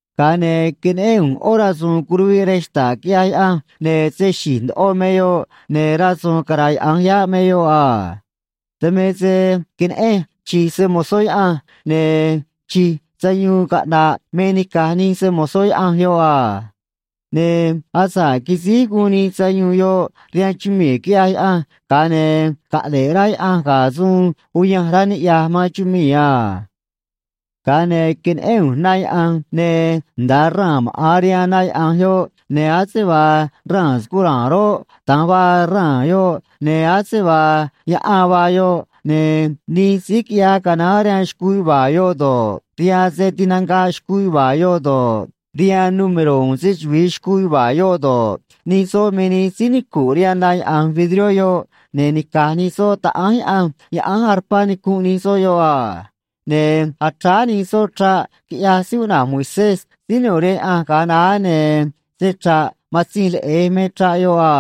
Ga̱a ne̱ queneꞌén ꞌu̱nj ꞌó rasu̱u̱n curuviꞌ rej xta̱ꞌ quiꞌyaj Yaꞌanj, ne̱ se xi̱j ndoꞌo me yoꞌ, ne̱ rasu̱u̱n caráyaꞌa̱nj yáꞌ me yoꞌ a. Dan me se queneꞌenj chi̱j se‑mo̱zó Yaꞌanj, ne̱ chi̱j sayuun caꞌna̱ꞌ me nica̱j nij se‑mo̱zó Yaꞌanj yoꞌ a. Ne̱ asa̱ꞌ quisíj guun nij sayuun yoꞌ rihaan chumii̱ quiꞌyaj Yaꞌanj, ga̱a ne̱ caꞌne̱ꞌ rá Yaꞌanj ga̱ suun uyanj rá niꞌya̱j man chumii̱ a. Ga̱a ne̱ queneꞌén ꞌu̱nj na yaꞌa̱nj, ne̱ nda̱a raa̱n maꞌa̱n rihaan na yaꞌa̱nj yoꞌ, ne̱ ase vaa raa̱n scura̱a̱n roꞌ, da̱nj vaa raa̱n yoꞌ, ne̱ ase vaa yaꞌan vaa yoꞌ, ne̱ nij síí quiꞌyaj canaán rihaan xcuu yuva̱a̱ yoꞌ do̱ꞌ, rihaan se tinanga̱ꞌ xcuu yuva̱a̱ yoꞌ do̱ꞌ, rihaan número̱ uun se‑chuvi̱i xcuu yuva̱a̱ yoꞌ do̱ꞌ, nij soꞌ me nij síí nicu̱nꞌ rihaan na yaꞌa̱nj vidrió yoꞌ, ne̱ nica̱j nij soꞌ taꞌánj Yaꞌanj yaꞌánj arpá nicunꞌ nij soꞌ yoꞌ a. Ne̱ achráá nij soꞌ chraꞌ quiꞌyaj síí cuꞌna̱j Moisés síí nu̱u̱ rihaan Yaꞌanj ga̱a naá, ne̱ se‑chra̱ꞌ Matzinj Leꞌe̱j me chraꞌ yoꞌ a.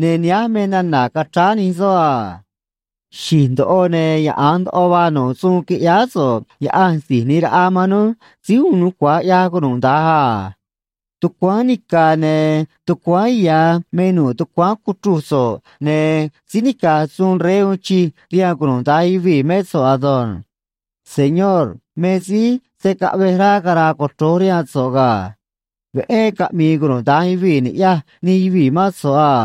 Ne̱ nihánj me nana̱ cachráá nij soꞌ a: Xi̱j ndoꞌo ne̱ yaꞌa̱nj ndoꞌo vaa nu̱ꞌ suun quiꞌyáá so̱ꞌ, Yaꞌanj Si̱j ꞌNi̱j Raꞌa man núj, Síí Uun Nucua̱j ꞌYaj Cunuda̱nj a. Tucuáán nica̱ ne̱ tucuáán ya̱ me nu̱ꞌ tucuáán cuchruj so̱ꞌ, ne̱ síí nica̱j suun rey uun chij rihaan cunuda̱nj yuvii̱ mé so̱ꞌ ado̱nj. Señor, me síí se̱ caꞌvej rá cara̱a̱ cochro̱j rihaan so̱ꞌ ga̱. Veꞌé caꞌmi̱i̱ cunuda̱nj yuvii̱ ni̱ꞌyaj nij yuvii̱ mán so̱ꞌ a.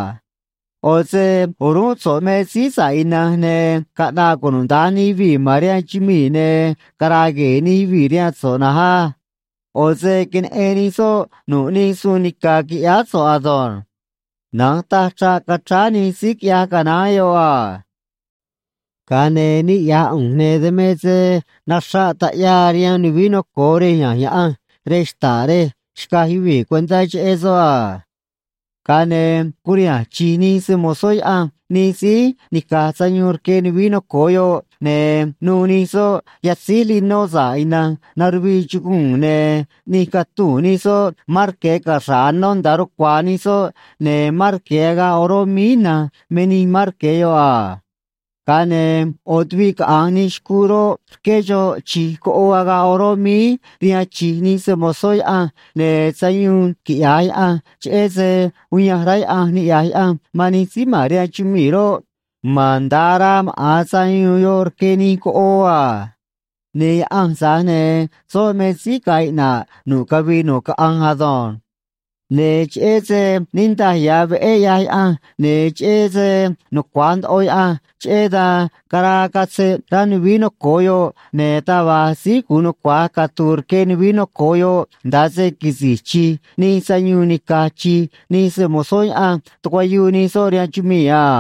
ꞌO̱ se o̱rúnꞌ so̱ꞌ me síí sa̱ꞌ ina̱nj, ne̱ caꞌna̱ꞌ cunuda̱nj nij yuvii̱ ma̱n rihaan chumii̱, ne̱ cara̱a̱ gue̱e̱ nij yuvii̱ rihaan so̱ꞌ na̱nj á. ꞌO̱ se queneꞌen nij soꞌ nu̱ꞌ nij suun nica̱ quiꞌyáá so̱ꞌ ado̱nj. Na̱nj taj chraꞌ cachráá nij síí quiꞌyaj canaán yoꞌ a. Ga̱a ne̱ niꞌya̱j ꞌu̱nj, ne̱ dan me se naxraꞌ taꞌyaa rihaan nuvií noco̱o rej ya̱nj Yaꞌanj rej xta̱ꞌ rej xcaj yuvii̱ cuentá cheꞌé soꞌ a. Ga̱a ne̱ curiha̱nj chi̱j nij se‑mo̱zó Yaꞌanj nij síí nica̱j sayuun rque nuvií noco̱o yoꞌ, ne̱ nu̱u̱ nij soꞌ yatzíj linó sa̱ꞌ ina̱nj naruvii chuguu̱n, ne̱ ꞌni̱j catuu̱n nij soꞌ marque̱ caxra̱ꞌ anó nda̱a rucua̱a̱ nij soꞌ, ne̱ marque̱ agaꞌ oró míí ina̱nj me nij marque̱ yoꞌ a. Ga̱a ne̱ ꞌo̱ tuviꞌ caꞌa̱nj nij xcuu roꞌ, rqué xoꞌ chi̱j coꞌoo agaꞌ oró míí rihaan chi̱j nij se‑mo̱zó Yaꞌanj, ne̱ sayuun quiꞌya̱j Yaꞌanj cheꞌé se uyanj rá Yaꞌanj niꞌya̱j Yaꞌanj man nij síí ma̱n rihaan chumii̱ roꞌ, ma̱an nda̱a araa maꞌa̱n sayuun yoꞌ rque nij coꞌoo a. Ne̱ Yaꞌanj, tza̱j ne̱ soꞌ me síí ga̱a̱ iꞌna̱ꞌ nu̱ꞌ cavii nu̱ꞌ caꞌanj ado̱nj. Ne̱ cheꞌé se niꞌndaj ya̱ veꞌé ꞌyaj Yaꞌanj ne̱ cheꞌé se nucua̱j ndoꞌo Yaꞌanj, cheꞌé dan caraa catzeꞌ rá nuvií noco̱o yoꞌ, ne̱ taj va̱j síí gu̱un nucua̱j catu̱u̱ rque nuvií noco̱o yoꞌ nda̱a se quisi̱j chi̱j nij sayuun nica̱j chi̱j nij se‑mo̱zó Yaꞌanj tucuayuu nij soꞌ rihaan chumii̱ a.